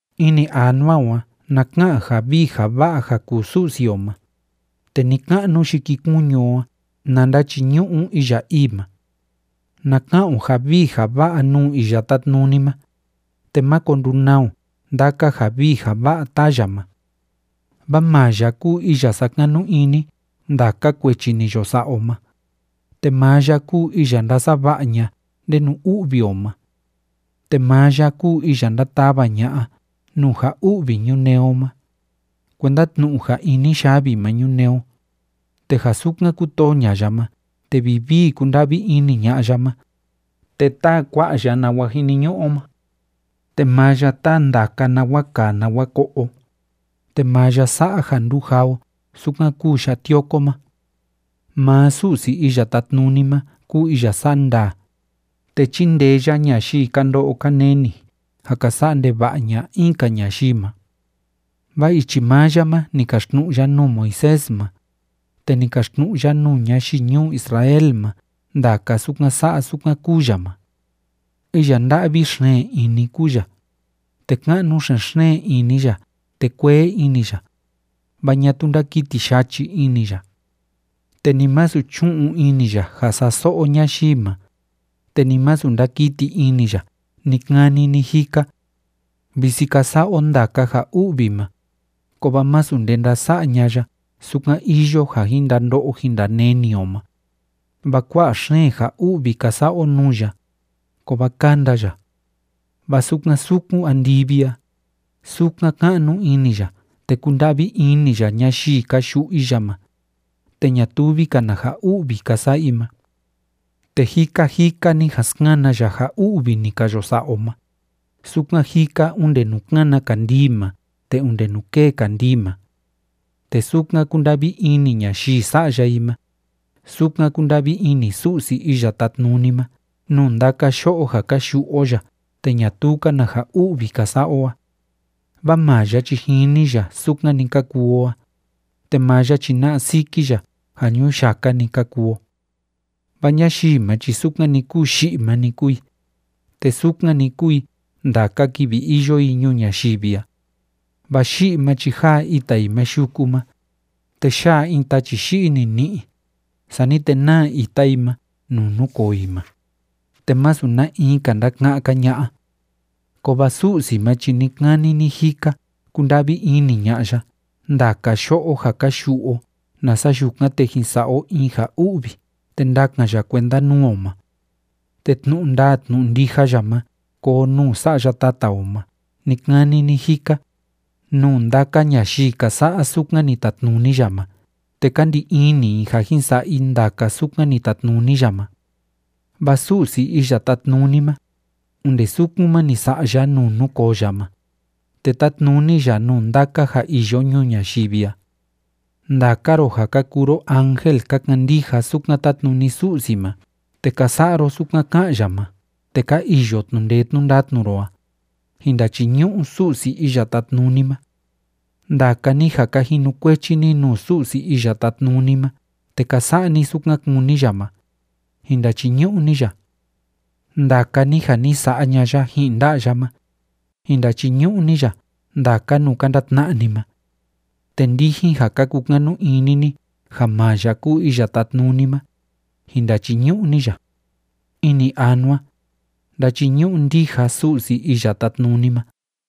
Ini anua o a na ka'an ja vii ja va'a ja kuu Su'si o ma, te ni‑ka'nu yikikuñu o a na ndachiñu'u iya ii ma. Na ka'an o ja vii ja va'a nuu Iya Tátnuni ma, te máko ndunaa o ndaka ja vii ja va'a táa ya ma. Vaa maa ya kúu iya sákanu ini ndaka kuechi ni yo sa'a o ma, te maa ya kúu iya ndásava'a ña'a ndenu u'vi o ma. Te maa ya kúu iya ndátava ña'a nuu ja u'vi ñunee o ma, kuenda tnu'u ja ini yavi ma ñunee o, te ja sukan kútoo ña'a ya ma te vivii kúnda'vi ini ña'a ya ma, te táa kua'a ya nawa jiniñu'u o ma. Te maa ya táa ndaka nawa kaa nawa ko'o o, te maa ya sa'a ja ndujaa o sukan kúu ya'a tioko ma. Maa Su'si Iya Tátnuni ma kúu iya sa'a ndaa, te chíndee ya ñayii ka ndo'o ka neni ja ka sa'a ndeva'a ña'a in‑ka ñayii ma. Vaa ichi maa ya ma ni kaxtnu'u ya nuu Moisés ma, te ni kaxtnu'u ya nuu ñayii ñuu Israel ma ndaka sukan sa'a sukan kúu ya ma. Iya nda'vi xeen ini kúu ya, te ka'nu xen‑xeen ini ya te kuee ini ya, vaa ñatuu ndákiti yachi ini ya. Te ni masu chú'un ini ya ja sa'a so'o ñayii ma, te ni masu ndakiti ini ya ni‑kani ni‑jika. Visi ka sa'a o ndaka ja u'vi ma, kovaa masu nde ndása'a ña'a ya sukan iyo ja jin ndando'o jin ndaneni o ma, vaa kua'a xeen ja u'vi ka sa'a o nuu ya, kovaa kánda ya. Vaa sukan sukun andivi a, sukan ka'nu ini ya te kúnda'vi ini ya ñayii ka yu'u i ya ma te ñatuvi‑ka na ja u'vi ka sa'a i ma. Te jika jika ni jan skana ya ja u'vi ni ka yo sa'a o ma, sukan jika onde nuu kána kandii ma te onde nuu kée kandii ma. Te sukan kúnda'vi ini ñayii sa'ya i ma, sukan kúnda'vi ini Su'si Iya Tátnuni ma nuu ndaka yo'o ja ka yu'u o ya te ñatuu‑ka na ja u'vi ka sa'a o a. Vaa maa ya chi jini ya sukan‑ni ka kuu o a, te maa ya chi na'a siki ya ja ñuyaka‑ni ka kuu o. Vaa ñayii ma chi sukan‑ni kúu yi'i ma‑ni kúu i, te sukan‑ni kúu i ndaka kivi iyo i ñuu ñayivi a. Vaa yi'i ma chi jáa ita i ma yuku ma, te yá'a in tachi yi'i nini'i, sani te náa ita i ma nuu núkoo i ma, te masu na in‑ka ndáka'án‑ka ña'a. Kovaa Su'si ma chi ni‑kani ni‑jika kúnda'vi ini ña'a ya ndaka yo'o ja ka yu'u o nasa yukan, te jin sa'a o in ja u'vi te ndakan ya kuenda nuu o ma. Te tnu'u ndaa tnu'u ndija ya ma koo nuu sa'ya tata o ma ni‑kani ni‑jika, nuu ndaka ñayii ka sa'a sukan ni tatnuni ya ma te ka ndi ini i ja jin sa'a i ndaka sukan ni tatnuni ya ma. Vaa Su'si Iya Tátnuni ma, onde sukun ma ni sa'a ya nuu núkoo ya ma, te tátnuni ya nuu ndaka ja iyo ñuu ñayivi a. Ndaka ro ja ka kuu ro ángel ka kandija sukan tátnuni Su'si ma te ka sa'a ro sukan ká'an ya ma te ka iyo tnu'u ndee tnu'u ndatnu ro a, jin ndachiñu'u Su'si Iya Tátnuni ma. Ndaka ni ja ka jinukuechi ni nuu Su'si Iya Tátnuni ma te ka sa'a ni sukan kúni ya ma, jin ndachiñu'u ni ya. Ndaka ni ja ni sa'a ña'a ya ji'in nda'a ya ma, jin ndachiñu'u ni ya ndaka nuu ka ndatna'a ni ma. Te ndijin ja ka kukanu ini ni ja maa ya kúu Iya Tátnuni ma, jin ndachiñu'u ni ya. Ini anua, ndachiñu'u ndija Su'si Iya Tátnuni ma.